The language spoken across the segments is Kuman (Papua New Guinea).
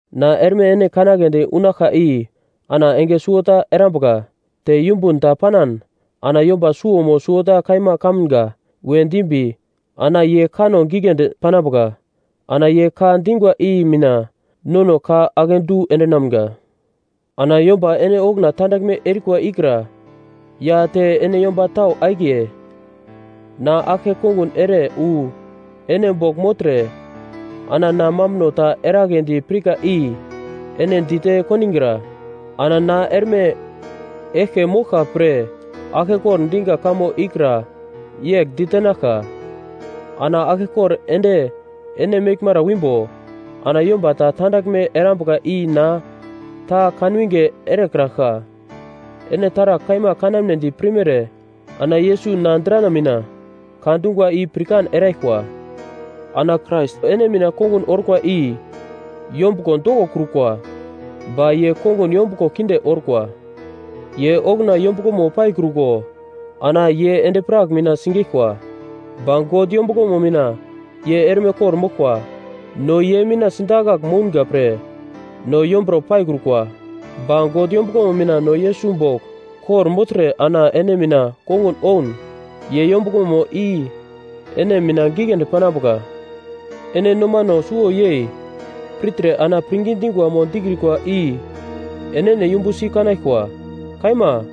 Na erme ene kanagledi unaglka i ana enge suwota erambuka. Te yumbun ta panan ana yomba suwo mo suwota kaima kamga we dimbi ana ye kanno giglendi panambuka. Ana ye ka dingwa i mina nono ka akedu endinamga. Ana yomba ene okuna tandaglme erikwa ikra ya te ene yomba tau akiye, na aglke kongun ere wu ene bogl mogltre ana na mambuno ta eragledi pirka i ene dite kondigra. Ana na erme eglke moglka pre aglkekor diga kamo ikra yegl ditenaglka: Ana aglkekor ende ene meglmara wimbo, ana yomba ta tandaglme erambuka i na ta kanwinge erekraglka. Ene taragl kaima kanamnedi pirmere ana Yesus na drana mina ka dungwa i pirkan eraglkwa. Ana Krais ene mina kongun orkwa i yombuglo dokokrukwa, ba ye kongun yombuglo kinde orkwa. Ye okuna yombuglomo paikruko ana ye endi-prak mina sigeglkwa, ba God yombuglomo mina ye erme kor-moglkwa. No ye mina sidakagl mounga pre no yomburo paikrukwa, ba God yombuglomo mina no Yesus bogl kor-mogltre ana ene mina kongun oun ye yombuglomo i ene mina giglendi panambuka. Ene nomano suwo yei pirtre ana pirngi dingwa mo dikrikwa i enene yumbusi kanaglkwa. Kaima,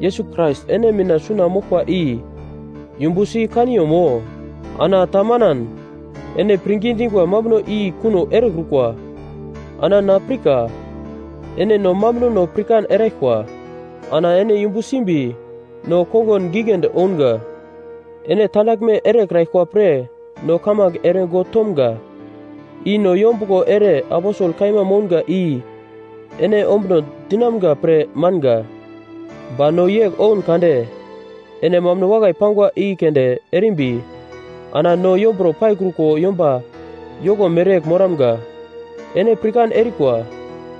Yesus Krais ene mina suna moglkwa i yumbu si kaniyomo? Ana ta manan, ene pirngi dingwa mambuno i kuno erekrukwa. Ana na pirka ene no mambunono pirkan eraglkwa, ana ene yumbu simbi no kongun giglendi ounga. Ene tandaglme erekraglkwa pre no kamange ere God tomga. I no yombuglo ere aposel kaima mounga i ene ombuno dinamga pre manga, ba no yegl oun kade ene mambuno wakai pangwa i keunde erimbi ana no yomburo paikruko yomba yoko mereyegl moramga. Ene pirkan erikwa,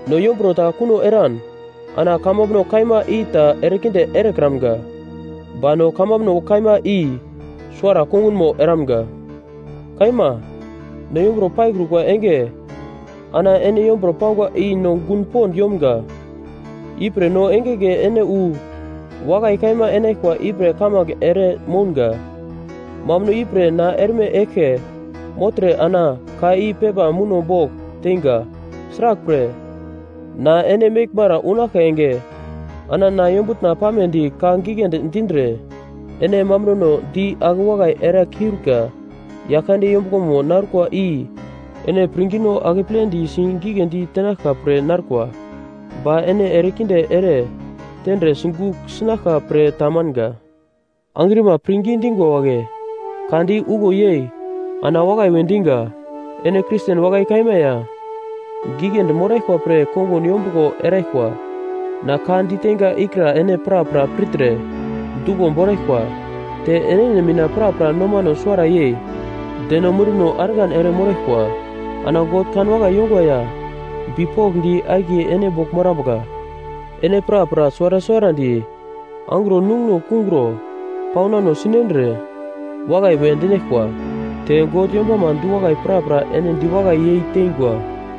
no yomburo ta kuno eran ana kamambuno kaima i ta erekinde erekramga, ba no kamambuno kaima i suwara kongunmo eramga. Kaima, no yomburo paikrukwa enge ana ene yomburo pangwa i no gun yomga. Ipre no engenge ene wu wakai kaima enaglkwa ipre kamange ere mounga. Mambuno ipre na erme eglke mogltre ana ka i pepa muno bogl teinga. Sraglpre, na ene meglmara unaglka enge ana na yombutna pamedi ka giglendi dindre ene mambunono di ake wakai era kiurika. Yaglkande yombuglomo narukwa i ene pirngino akepledi sigigledi tenaglka pre narkwa, ba ene erekinde ere tendre sigugl sinaglka pre ta manga. Angrima pirngi dingwa wagle, ka di uglo yei ana wakai we diga. Ene Kristen wakai kaima ya giglendi moraglkwa pre kongun yombuglo eraglkwa. Na ka diteinga ikra ene prapra pirtre duglo boraglkwa. Te enene mina prapra nomano suwara yei deno munduno argan ere moraglkwa. Ana God kanwakai yongwa ya bipokndi akiye ene bogl morambuka. Ene prapra suwara suwarandi angro nunguno kungro paunan sinendre wakai we dinaglkwa. Te God yombama du-wakai prapra ene diwakai yei tengwa.